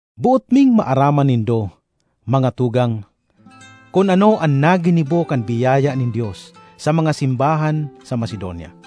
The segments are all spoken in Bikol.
Boot ming maaraman nindo, mga tugang, kun ano an naginibo kan biyaya nin Dios sa mga simbahan sa Macedonia.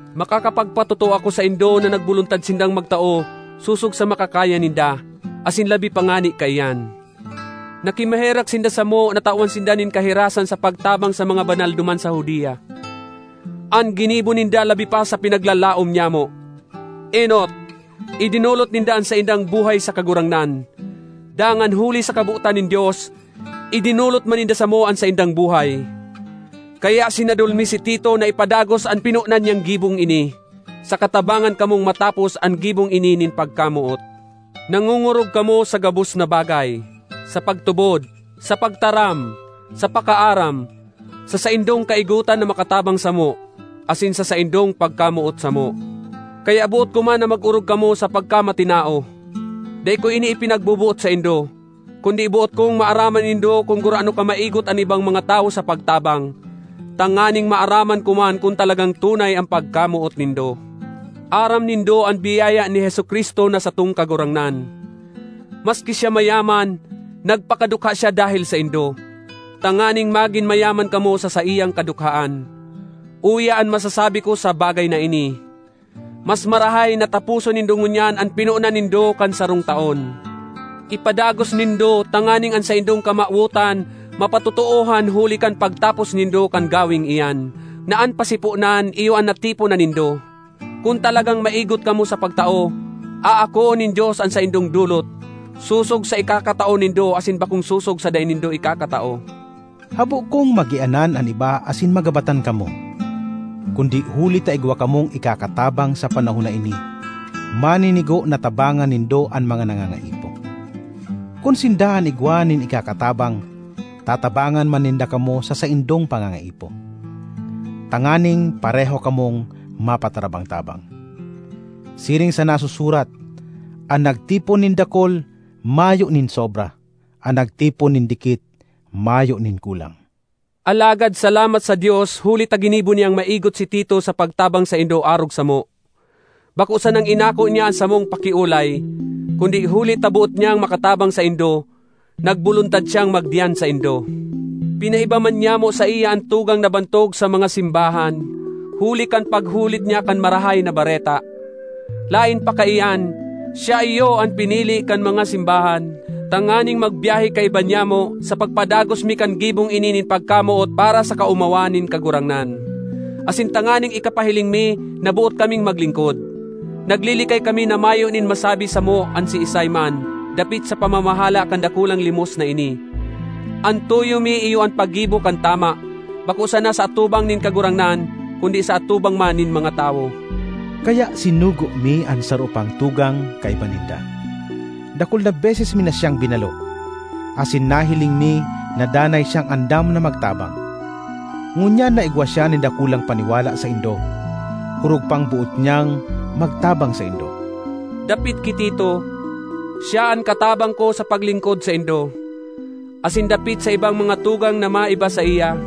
Makakapagpatotoo ako saindo na nagboluntad sindang magtao sosog sa makakaya ninda, asin labi pa ngani kaiyan. Nakimaherak sinda samo na tawan sinda nin kahirasan sa pagtabang sa mga banal duman sa Judea. An ginibo ninda labi pa sa pinaglalaom nyamo. Enot, idinolot ninda an saindang buhay sa Kagurangnan; dangan, huli sa kabotan nin Dios, idinolot man ninda samo an saindang buhay. Kaya sinadol mi si Tito na ipadagos an pinonan niyang gibong ini, saka tabangan kamong matapos an gibong ini nin pagkamoot. Nangongorog kamo sa gabos na bagay: sa pagtubod, sa pagtaram, sa pakaaram, sa saindong kaigotan na makatabang samo, asin sa saindong pagkamoot samo; kaya boot ko man na mag-orog kamo sa pagkamatinao. Dai ko ini ipinagboboot saindo, kundi boot kong maaraman nindo kun gurano kamaigot an ibang mga tawo sa pagtabang, tanganing maaraman ko man kun talagang tunay an pagkamoot nindo. Aram nindo an biyaya ni Jesu-Cristo na satong Kagurangnan: maski siya mayaman, nagpakadukha siya dahel saindo, tanganing magin mayaman kamo sa saiyang kadukhaan. Uya an masasabi ko sa bagay na ini: mas marahay na taposon nindo ngunyan an pinonan nindo kan sarong taon. Ipadagos nindo tanganing an saindong kamawotan mapatotoohan huli kan pagtapos nindo kan gaweng iyan, na an pasiponan iyo an natipon na nindo. Kun talagang maigot kamo sa pagtao, aakoon nin Dios an saindong dolot, sosog sa ikakatao nindo asin bakong sosog sa dai nindo ikakatao. Habo kong magianan an iba asin magabatan kamo; kundi huli ta igwa kamong ikakatabang sa panahon na ini, maninigo na tabangan nindo an mga nangangaipo. Kun sinda an igwa nin ikakatabang, tatabangan man ninda kamo sa saindong panganga-ipo, tanganing pareho kamong mapatarabang-tabang. Siring sa nasusurat, “An nagtipon nin dakul mayo nin sobra; an nagtipon nin dikit mayo nin kulang.” Alagad salamat sa Dios huli ta ginibo niyang maigot si Tito sa pagtabang saindo arog samo! Bako sanang inako niya an samong pakiolay, kundi huli ta boot niyang makatabang saindo, nagboluntad siyang magdiyan saindo. Pinaiba man nyamo saiya an tugang na bantog sa mga simbahan huli kan paghulit niya kan Marahay na Bareta. Laen pa kaiyan, siya iyo an pinili kan mga simbahan tanganing magbiyahe kaiba nyamo sa pagpadagos mi kan gibong ini nin pagkamoot para sa kaomawan nin Kagurangnan, asin tanganing ikapahiling mi na boot kaming maglingkod. Naglilikay kami na mayo nin masabi samo an siisay man dapit sa pamamahala kan dakulang limos na ini. An tuyo mi iyo an paggibo kan tama, bako sana sa atubang nin Kagurangnan, kundi sa atubang man nin mga tawo. Kaya sinugo mi an saro pang tugang kaiba ninda; dakul na beses mi na siyang binalo, asin nahiling mi na danay siyang andam na magtabang. Ngunyan na igwa siya nin dakulang paniwala saindo, orog pang boot niyang magtabang saindo. Dapit ki Tito, siya an katabang ko sa paglingkod saindo; asin dapit sa ibang mga tugang na maiba saiya,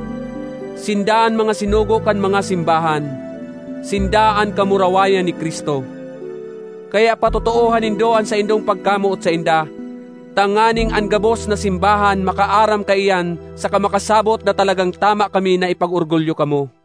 sinda an mga sinugo kan mga simbahan, sinda an kamurawayan ni Cristo. Kaya patotoohan nindo an saindong pagkamoot sainda, tanganing an gabos na simbahan makaaram kaiyan saka makasabot na talagang tama kami na ipag-orgulyo kamo.